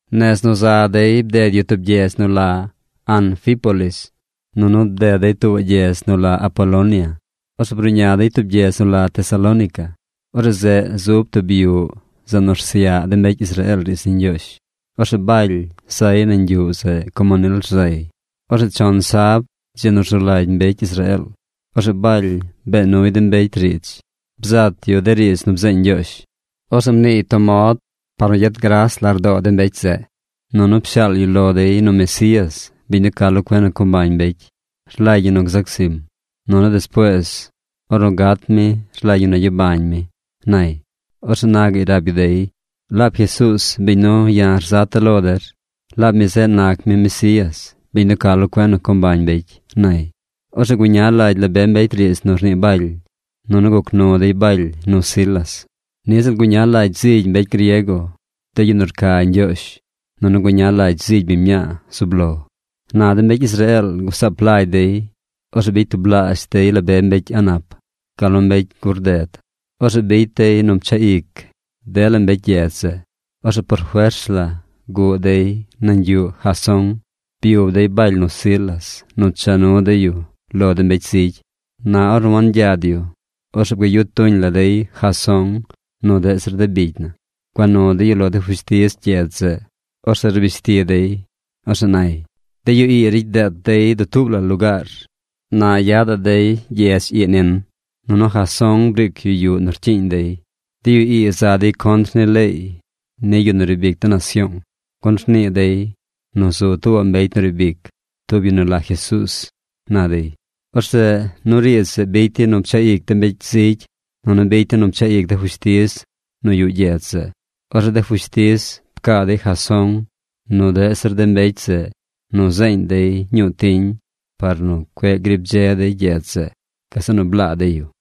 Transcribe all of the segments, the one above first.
Nez nu za dey bded yu tub gyedz nu la Anfípolis, nunu bded dey tuubaꞌ gyedz nu la Apolonia. Orzeꞌ bruꞌña dey tub gyedz nu la Tesalónica. Orzeꞌ zeꞌ zub tub yuꞌ zeꞌ nu rsyaꞌ mbecy Israeel riidz ni Ñgyoozh. Orzeꞌ Baly zay nañ yuꞌ zeꞌ como nil rzay. Orzeꞌ chon sab, dzi nu rzu lagy mbecy Israeel, orzeꞌ Baly bee nuy de mbecy riidz. Bzat yu de riidz nu bzeeñ Ñgyoozh. Orzeꞌ mniiy tub mod par nu gyet gras lardoo de mbecy zeꞌ, nunu pshaal yu lo dey nu Mesías, bin nu ca lo cuen nu co mbañ mbecy, rlagy ñi nu gzac zim, nunu despuees ornu gat mi rlagy ñi nu gyabañ mi, nay. Orzeꞌ na gaꞌy rab yu dey: ―Laab Jesuuz, biñ nu ya̱ rzata̱ lo der, laab mi zeꞌ nac mi Mesías, biñ nu ca lo cuen nu co mbañ mbecy ―nay. Orzeꞌ guña lagy la be mbecy riidz nu rnii Baly, nunu guc nu dey Baly nu Silas. Niꞌ ziꞌl guña lagy zigy mbecy griego, de yu nu rca Ñgyoozh, nunu guña lagy zigy biñ mñaa zub lo. Na de mbecy Israeel gusaap lagy dey. Orzeꞌ bicy tublaazh dey la be mbecy a̱ꞌ nap, gal nu mbecy gur rded. Orzeꞌ bicy dey nu pchaꞌ ic dela mbecy gyedz zeꞌ. Orzeꞌ por fers la guꞌ dey nañ yuꞌ Jasón. Byub dey Baly nu Silas nu cha nu dey yu lo de mbecy zigy. Na ornu wangyad yu, orzeꞌ bgayu tuñ la dey Jasón nu deꞌ zir de bicy na. Gua nu dey yu lo de fushtiz gyedz zeꞌ. Orzeꞌ rbish ti dey. Orzeꞌ nay: ―¡De yu ii ricy deet dey dutuub la lugaar! ¡Na yadaꞌ dey gyedz ii nin! ¡Nunu Jasón briic yu yuꞌ nu rcyiiñ dey! ¡De yu ii za dey contr ni leey ni yu nu riib ic de nasyoong, gun rnii dey nu zu tuubaꞌ mbecy nu riib ic, tub yu nu la Jesuuz! ―na dey. Orzeꞌ nu riidz zeꞌ bicy dey nu pchaꞌ ic de mbecy zigy, nunu bicy dey nu pchaꞌ ic de fushtiz nu yuꞌ gyedz zeꞌ. Orzeꞌ de fushtiz pcaa dey Jasón nu deꞌ zir de mbecy zeꞌ nu zeeñ dey ñuu tiñ par nu cueꞌ grib dze dey gyedz zeꞌ. Gazeꞌ nu blaa dey yu.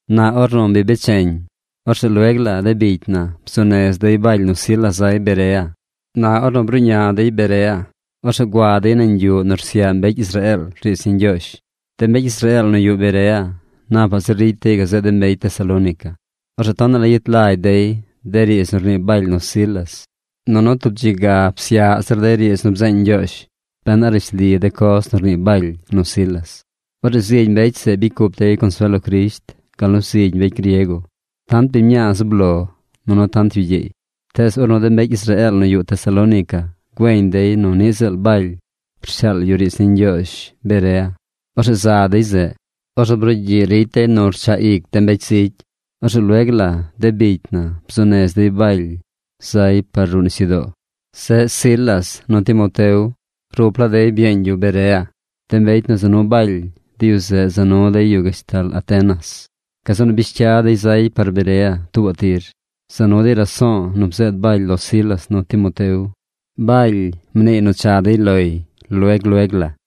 Na ornu bi becheñ, orzeꞌ lueg la de bicy na bzuu nez dey Baly nu Silas zay Berea. Na ornu bruꞌña dey Berea, orzeꞌ gua dey nañ yuꞌ nu rsyaꞌ mbecy Israeel riidz ni Ñgyoozh. De mbecy Israeel nu yuꞌ Berea napaꞌ zir ricy dey gazeꞌ de mbecy Tesalónica. Orzeꞌ tonaꞌ la yet lagy dey de riidz nu rnii Baly nu Silas. Nunu tub dzi ga psyaꞌ zir dey riidz nu bzeeñ Ñgyoozh ben a rishli de coz nu rnii Baly nu Silas. Orzeꞌ zigy mbecy zeꞌ bicy cup dey consuel lo Crisht gal nu zigy mbecy griego: tant biñ mñaa zub lo, nunu tant yu gyeey. Tees ornu de mbecy Israeel nu yuꞌ Tesalónica güeñ dey nu niꞌ ziꞌl Baly rshaal yu riidz ni Ñgyoozh Berea, orzeꞌ za dey zeꞌ. Orzeꞌ brugyiꞌ ricy dey nu rchaꞌ ic de mbecy zigy. Orzeꞌ lueg la de bicy na bzuu nez dey Baly zay par ruꞌ nisyudoo. Zeꞌ Silas nu Timoteo rup laa dey byeeñ yu Berea. De mbecy nu za nu Baly, de yu zeꞌ za nu dey yu gashtal Atenas. Gazeꞌ nu bish cya dey zay par Berea tuubaꞌ tir. Za nu dey raso̱o̱ nu bzeed Baly lo Silas nu Timoteo. Baly mniiy nu cha dey loy lueg lueg la.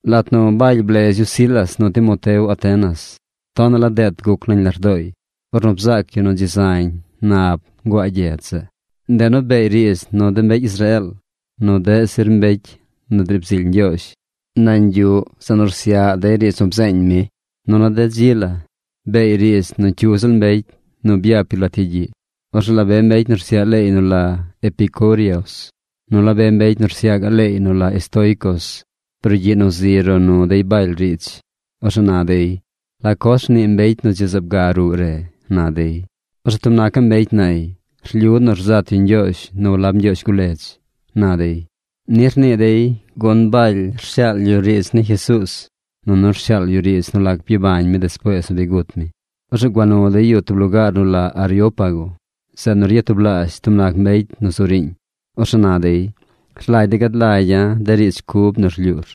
Lat nu Baly blez yu Silas nu Timoteo Atenas, tonaꞌ la deet guc nañ lardooy ornu bzaac yu nu dzi zañ nab nguaa gyedz zeꞌ. Ndeꞌ nu beey riidz nu de mbecy Israeel nu deꞌ zir mbecy nu driib zily Ñgyoozh nañ yuꞌ zeꞌ nu rsyaꞌ dey riidz nu bzeeñ mi. Nunu de dzi la beey riidz nu cyu ziꞌl mbecy nu byap yu lat yagyiꞌ. Orzeꞌ la be mbecy nu rsyaꞌ leey nu la epicúreos nu la be mbecy nu rsyaꞌ gaꞌ leey nu la estoicos brugyiꞌ nu zi ro nu dey Baly riidz. Orzeꞌ na dey: ―¿La coz rnii mbecy nu dzi zaab ga ruꞌ re? ―na dey. Orzeꞌ tub nacaꞌ mbecy nay: ―Rlyu nu rzat yu ñgyoozh nu walab ñgyoozh guledz ―na dey. Ni rnii dey, gun Baly rshaal yu riidz ni Jesuuz, nunu rshaal yu riidz nu lac byabañ mi despuees nu bi gut mi. Orzeꞌ gua nu dey yu tub lugaar nu la Areópago, zeꞌ nu ryatublaazh tub nac mbecy nu zu riiñ. Orzeꞌ na dey: ―Rlagy de̱ gad lagya̱ de riidz cub nu rlyuur.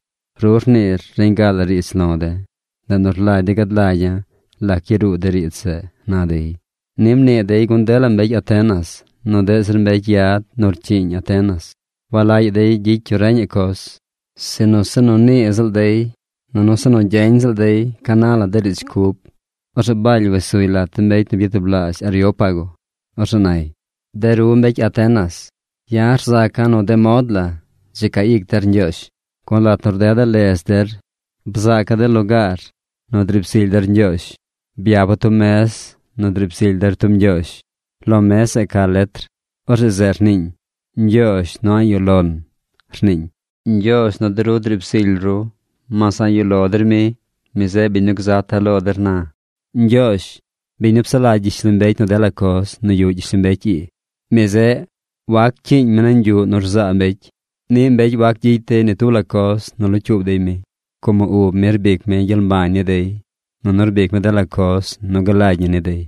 Ru rniir reñ ga la riidz lo de̱, ndeꞌ nu rlagy de̱ gad lagya̱ lac yaruu de riidz zeꞌ ―na dey. Ni mnii dey gun dela mbecy Atenas nu deꞌ zir mbecy yad nu rcyiiñ Atenas walagyaꞌ dey gyicy yu reñaꞌ coz, sinu se nu niiy ziꞌl dey nunu se nu gyeñ ziꞌl dey ca na la de riidz cub. Orzeꞌ Baly wes suy lat de mbecy nu byatublaazh Areópago. Orzeꞌ nay: ―De ru mbecy Atenas, ya̱ rzaca̱ nu de mod la dzi ca ic der Ñgyoozh. Gun lat nu rdeda̱ ledz der, bzaaca̱ de lugaar nu driib zily der Ñgyoozh. Byapa̱ tub mez nu driib zily der tub ñgyoozh. Lo mez zeꞌ ca letr. Orzeꞌ zeꞌ rniiñ: “Ñgyoozh nu a̱ꞌ yuꞌ lon”, rniiñ. Ñgyoozh nu de ru driib zily ru, mas a̱ꞌ yuꞌ lo der mi, mi zeꞌ biñ nu gzata̱ lo der na. ’Ñgyoozh, biñ nu psaꞌ lagy gyishlombecy nu dela coz nu yuꞌ gyishlombecy ii, mi zeꞌ waccyiiñ mi nañ yuꞌ nu rzaa mbecy. Niꞌ mbecy wac gyicy dey ni tub la coz nu locyuub dey mi, como ub mi rbic mi gyel mbañ ni dey, nunu rbic mi dela coz nu galagy ñi ni dey.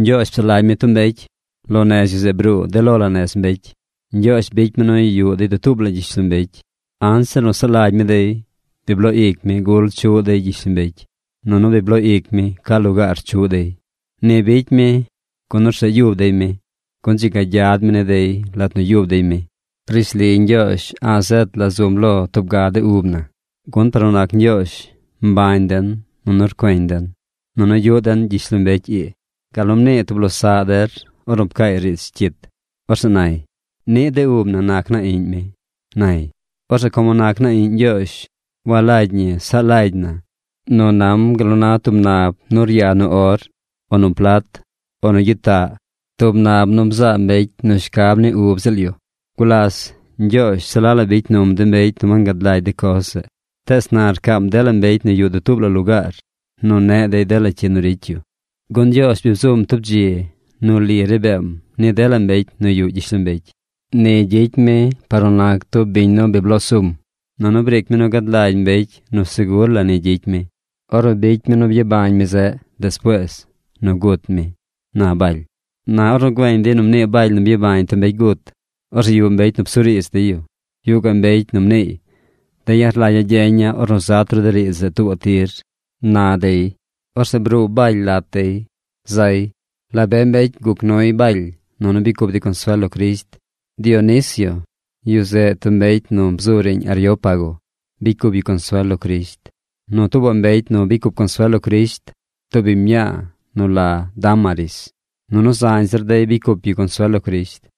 ’Ñgyoozh psaꞌ lagy mi tub mbecy. Lo nez yu zeꞌ bruu de lo la nez mbecy. Ñgyoozh bicy mi nu yuꞌ dey dutuub la gyishlombecy. Anzir nu saꞌ lagy mi dey, bi bloo ic mi gul chuꞌ dey gyishlombecy, nunu bi bloo ic mi ca lugaar chuꞌ dey. Ni bicy mi, gun orzeꞌ yub dey mi, gun dzi ga gyad mi ni dey lat nu yub dey mi. Rishli Ñgyoozh a̱ꞌ zet la zum lo tub ga de ub na. Gun par nu nac Ñgyoozh, mbañ den, nunu rcueñ den, nunu yuꞌ den gyishlombecy ii. Gal nu mnii tub losaꞌ der ornu pcaay riidz cyit. Orzeꞌ nay: “Niꞌ de ub na nac naa iꞌñ mi”, nay. Orzeꞌ como nac naa iꞌñ Ñgyoozh walagy ñi saꞌ lagy na nu nam gal nu na tub nab nu ryaa nu or o nu plat o nu gyitaꞌ, tub nab nu bzaa mbecy nu shcab ni ub ziꞌl yu. Gulas Ñgyoozh se la la bicy num de mbecy nu wangad lagy de coz zeꞌ. Tees na rcaam dela mbecy nu yuꞌ dutuub la lugaar nu neꞌ dey dela cyi nu ricy yu. Gun Ñgyoozh bi bzum tub dzi nu li ri beem ni dela mbecy nu yuꞌ gyishlombecy. Ni gyicy mi par nu nac tub biñ nu bi bloo sum. Nunu briic mi nu gad lagy mbecy nu segur la ni gyicy mi ornu bicy mi nu byabañ mi zeꞌ despuees nu gut mi ―na Baly. Na ornu güeñ dey nu mnii Baly nu byabañ tub mbecy gut, orzeꞌ yuꞌ mbecy nu psuriidz dey yu. Yuꞌ gaꞌ mbecy nu mniiy: ―De̱ ya̱ rlagya̱ gyeña̱ ornu zat ru de riidz zeꞌ tuubaꞌ tir ―na dey. Orzeꞌ bruu Baly lat dey. Zay. La be mbecy guc nuy Baly, nunu bicy cup dey consuel lo Crisht. Dionisio, yu zeꞌ tub mbecy nu bzu riiñ Areópago bicy cup yu consuel lo Crisht. Nu tuubaꞌ mbecy nu bicy cup consuel lo Crisht, tub biñ mñaa nu la Dámaris. Nunu zañ zir dey bicy cup yu consuel lo Crisht.